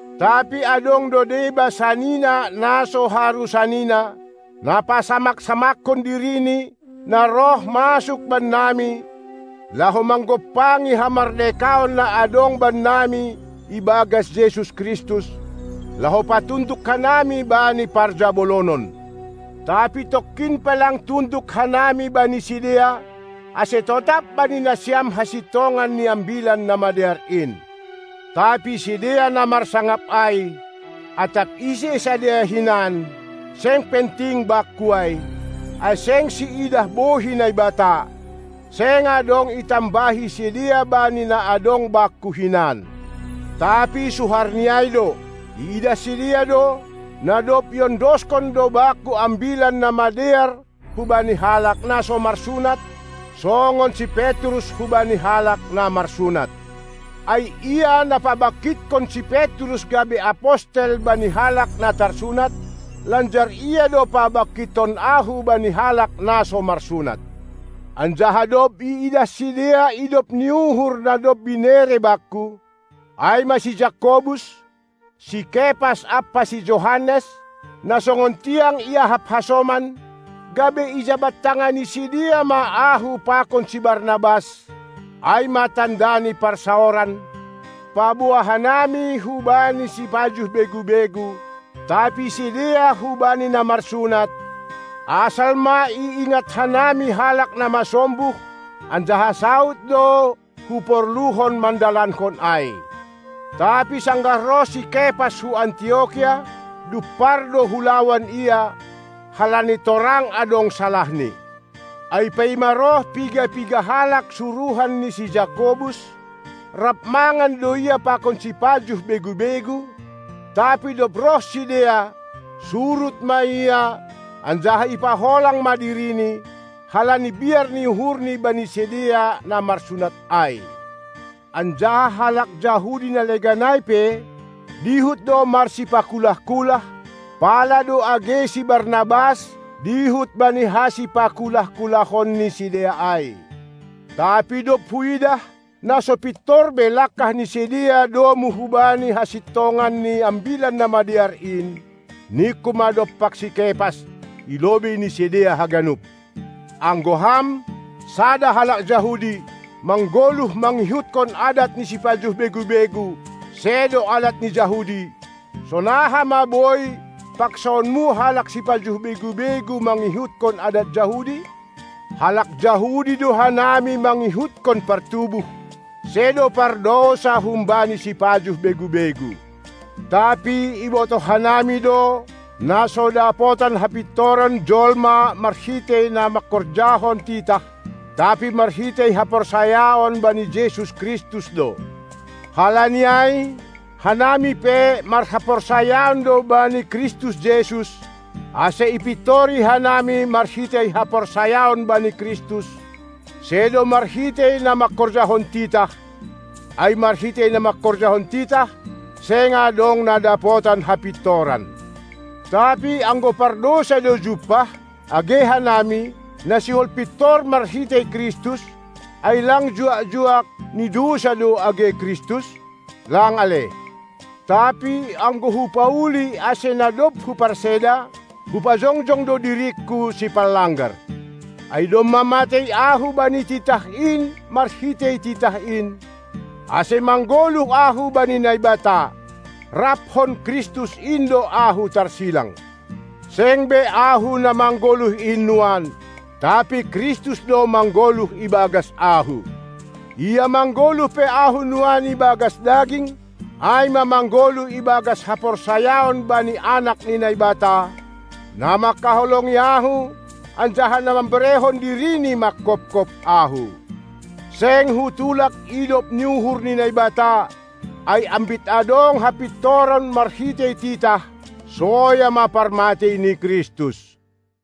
Tapi adong do deba sanina na so haru sanina, na pasamak-samakkon dirini, na roh masuk bannami, laho manggompangi hamardekaon na adong bannami ibagas Jesus Kristus, laho patunduk hanami bani parjabolonon. Tapi tongkin pe lang tunduk hanami bani sidea, ase totap bani nasiam hasintongan ni Ambilan Namadear in. Tapi sidea na marsangap ai (atap ise sidea hinan, seng penting bakku ai, ai seng siidah bohi Naibata), seng adong itambahi sidea bani na adong bakku hinan. Tapi suharni ai do, iidah sidea do, na dob iondoskon do bakku Ambilan Namadear hubani halak na so marsunat, songon si Petrus hubani halak na marsunat. Ai Ia, na pabangkithon si Petrus gabe apostel bani halak na tarsunat, lanjar Ia do pabangkithon ahu bani halak na so marsunat. Anjaha dob iidah sidea idop ni uhur na dob binere bakku, ai ma si Jakobus, si Kepas ampa si Johannes, na songon tiang iahap hasoman, gabe ijabat-tangani sidea ma ahu pakon ni Barnabas, ai ma tanda ni parsaoran, paboa hanami hubani sipajuh begu-begu, tapi sidea hubani na marsunat, asal ma iingat hanami halak na masombuh; anjaha saud do huporluhon mandalankon ai. Tapi sanggah roh si Kepas hu Antiokia, dumpar do hulawan ia, halani torang adong salahni. Ai paima roh piga-piga halak suruhan ni si Jakobus, rap mangan do ia pakon sipajuh begu-begu, tapi dob roh sidea, surut ma ia anjaha ipaholang ma dirini, halani biar ni uhurni bani sidea na marsunat ai. Anjaha halak Jahudi na legan ai pe dihut do marsipakulah-kulah, pala do age si Barnabas dihut bani hasipakulah-kulahon ni sidea ai. Tapi dob huidah, na so pintor be langkah ni sidea domu hubani hasintongan ni Ambilan Namadear in, ningku ma dompak si Kepas i lobei ni sidea haganup: Anggo ham, sada halak Jahudi, manggoluh mangihutkon adat ni sipajuh begu-begu, sedo adat ni Jahudi, sonaha ma boi paksaonmu halak sipajuh begu-begu, mangihutkon adat Jahudi? Halak Jahudi do hanami mangihutkon partubuh, sedo pardousa humbani sipajuh begu-begu. Tapi ibotoh hanami do, na so dapotan hapintoran jolma marhitei na mangkorjahon titah, tapi marhitei haporsayaon bani Jesus Kristus do. Halani ai, hanami pe, marhaporsayaon do bani Kristus Jesus, ase ipintori hanami marhitei haporsayaon bani Kristus, sedo marhitei na mangkorjahon titah, ai marhitei na mangkorjahon titah, seng adong na dapotan hapintoran. Tapi anggo pardousa do jumpah age hanami, na sihol pintor marhitei Kristus, ai lang juak-juak ni dousa ma age Kristus? Lang ale! Tapi anggo hupauli ase na dob huparseda, hupajongjong do diringku sipanlanggar. Ai domma matei ahu bani titah in marhitei titah in, ase manggoluh ahu bani Naibata. Raphon Kristus in do ahu tarsilang. Seng be ahu na manggoluh in nuan, tapi Kristus do manggoluh ibagas ahu. Ia manggoluh pe ahu nuan ibagas daging, ai ma manggoluh ibagas haporsayaon bani Anak ni Naibata, na manghaholongi ahu anjaha na mamberehon diriNi manghophop ahu. Seng hutulak idop ni uhur ni Naibata, ai ambit adong hapintoran marhitei titah, soya ma parmatei ni Kristus.